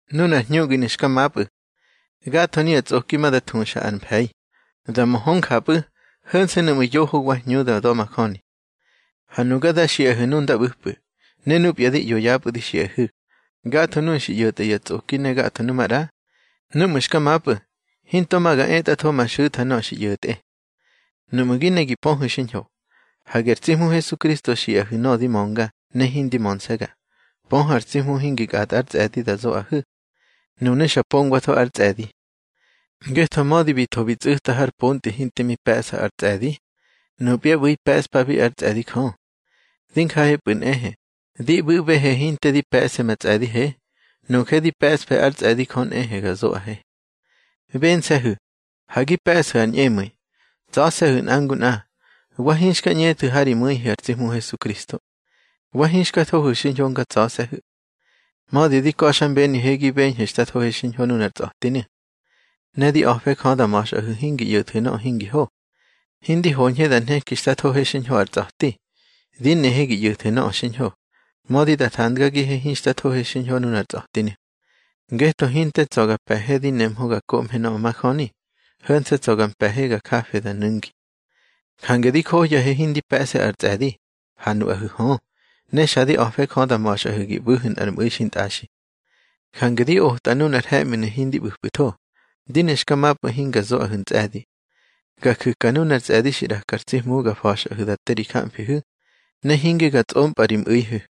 Nunar hñuꞌginu̱ xka mapꞌu̱. Gatho nuya tsꞌoki ma da thuxa ar mfe̱i, da mö hö njapꞌu̱, ho̱nse̱ nuꞌmu̱ yoho wa hñu da da̱majöni. Ha nuga da xiꞌahu̱ nu nda ꞌbu̱pꞌu̱, ne nupya di ꞌyo yapꞌu̱ di xiꞌahu̱, gatho nuꞌu̱ xi ꞌyo̱tꞌa ya tsꞌoki ne gatho numaꞌra, núꞌmu̱ xka mapꞌu̱, hinto ma ga etꞌatho ma xu̱tha nöꞌö xi ꞌyo̱tꞌe. Nuꞌmu̱ gi ne gi pöhu̱ xiñho, hage ar tsi Hmu Hesukristo xiꞌahu̱ nöꞌö di mönga ne hindi mönse̱ga, pöhu̱ ar tsi Hmu hingi kꞌatꞌa ár tsꞌe̱di da zoꞌahu̱. Nunu̱ xa pongwatho ár tsꞌe̱di. Ngetho mödi bi tho bi tsꞌu̱ta har pontꞌi hinte mi pe̱ꞌsa ar tsꞌe̱di, nupya ꞌbu̱i pe̱ꞌspabi ár tsꞌe̱di Jö. Di njahepꞌu̱ nꞌehe, di ꞌbu̱ꞌbehe hinte di pe̱ꞌse ma tsꞌe̱dihe. Nuje di pe̱ꞌsfe ár tsꞌe̱di Jö nꞌehe ga zoꞌahe. Bense̱hu̱, ha gi pe̱ꞌsu̱ ar ñꞌemu̱i. Tsa̱se̱hu̱ nꞌa ngu nꞌa, wa hinxka ꞌñethu̱ ha ri mu̱ihu̱ ar tsi Hmu Hesukristo. Wa hinxka thohu̱ xiñho nga tsa̱se̱hu̱. Mödi di ka̱xmbenihe gi beñhu̱ xta thohe xiñho nunar tsa̱tinu̱. Ne di a̱fe Jö da ma̱xꞌahu̱ hingi ꞌyo̱thu̱ nöꞌö hingi ho. Hindi hoñhe da nheki xta thohe xiñho ar tsa̱ti. Di nehe gi ꞌyo̱thu̱ nöꞌö xiñho, mödi da thandgagihe hinxta thohe xiñho nunar tsa̱tinu̱. Ngetho hinte tsa̱ ga pe̱he di nemhö ga koꞌmhe nöꞌö majöni. Ho̱nse̱ tsa̱ ga mpe̱he ga jafe da nu̱ngi. Jange di johyahe hindi pe̱ꞌse ar tsꞌe̱di, ha nuꞌahu̱ hö. Ne xa di a̱fe Jö da ma̱xꞌahu̱ gi ꞌbu̱hu̱ nꞌar mꞌu̱i xintꞌaxi. Jange di otꞌahu̱ nunar he̱ꞌminu̱ hindi ꞌbu̱pꞌu̱tho, di ne xka mapꞌu̱ hinga zoꞌahu̱ ntsꞌe̱di. Ga ju̱ka nunar tsꞌe̱di xi ꞌraka ar tsi Hmu ga fa̱xꞌahu̱ da te ri jamfihu̱, ne hinge ga tsꞌompꞌa ri mꞌu̱ihu̱.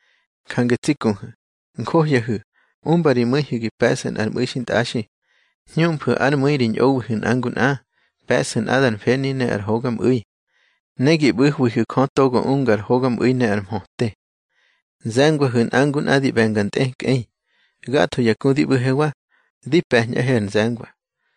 Jange tsi kuhu̱, njohyahu̱, umba ri mu̱ihu̱ gi pe̱ꞌsu̱ nꞌar mꞌu̱i xintꞌaxi, hñuꞌmfu̱ ár mu̱i ri ñꞌowihu̱ nꞌa ngu nꞌa, pe̱ꞌsu̱ nꞌadar mfeni ne ar hogamꞌu̱i. Ne gi ꞌbu̱hwihu̱ Jö togo unga ar hogamꞌu̱i ne ar mhöte. Nze̱ngwahu̱ nꞌa ngu nꞌa di ꞌbe̱nga ar tꞌekꞌei. Gatho ya ku di ꞌbu̱hewa, di pe̱ñꞌahe ar nze̱ngwa.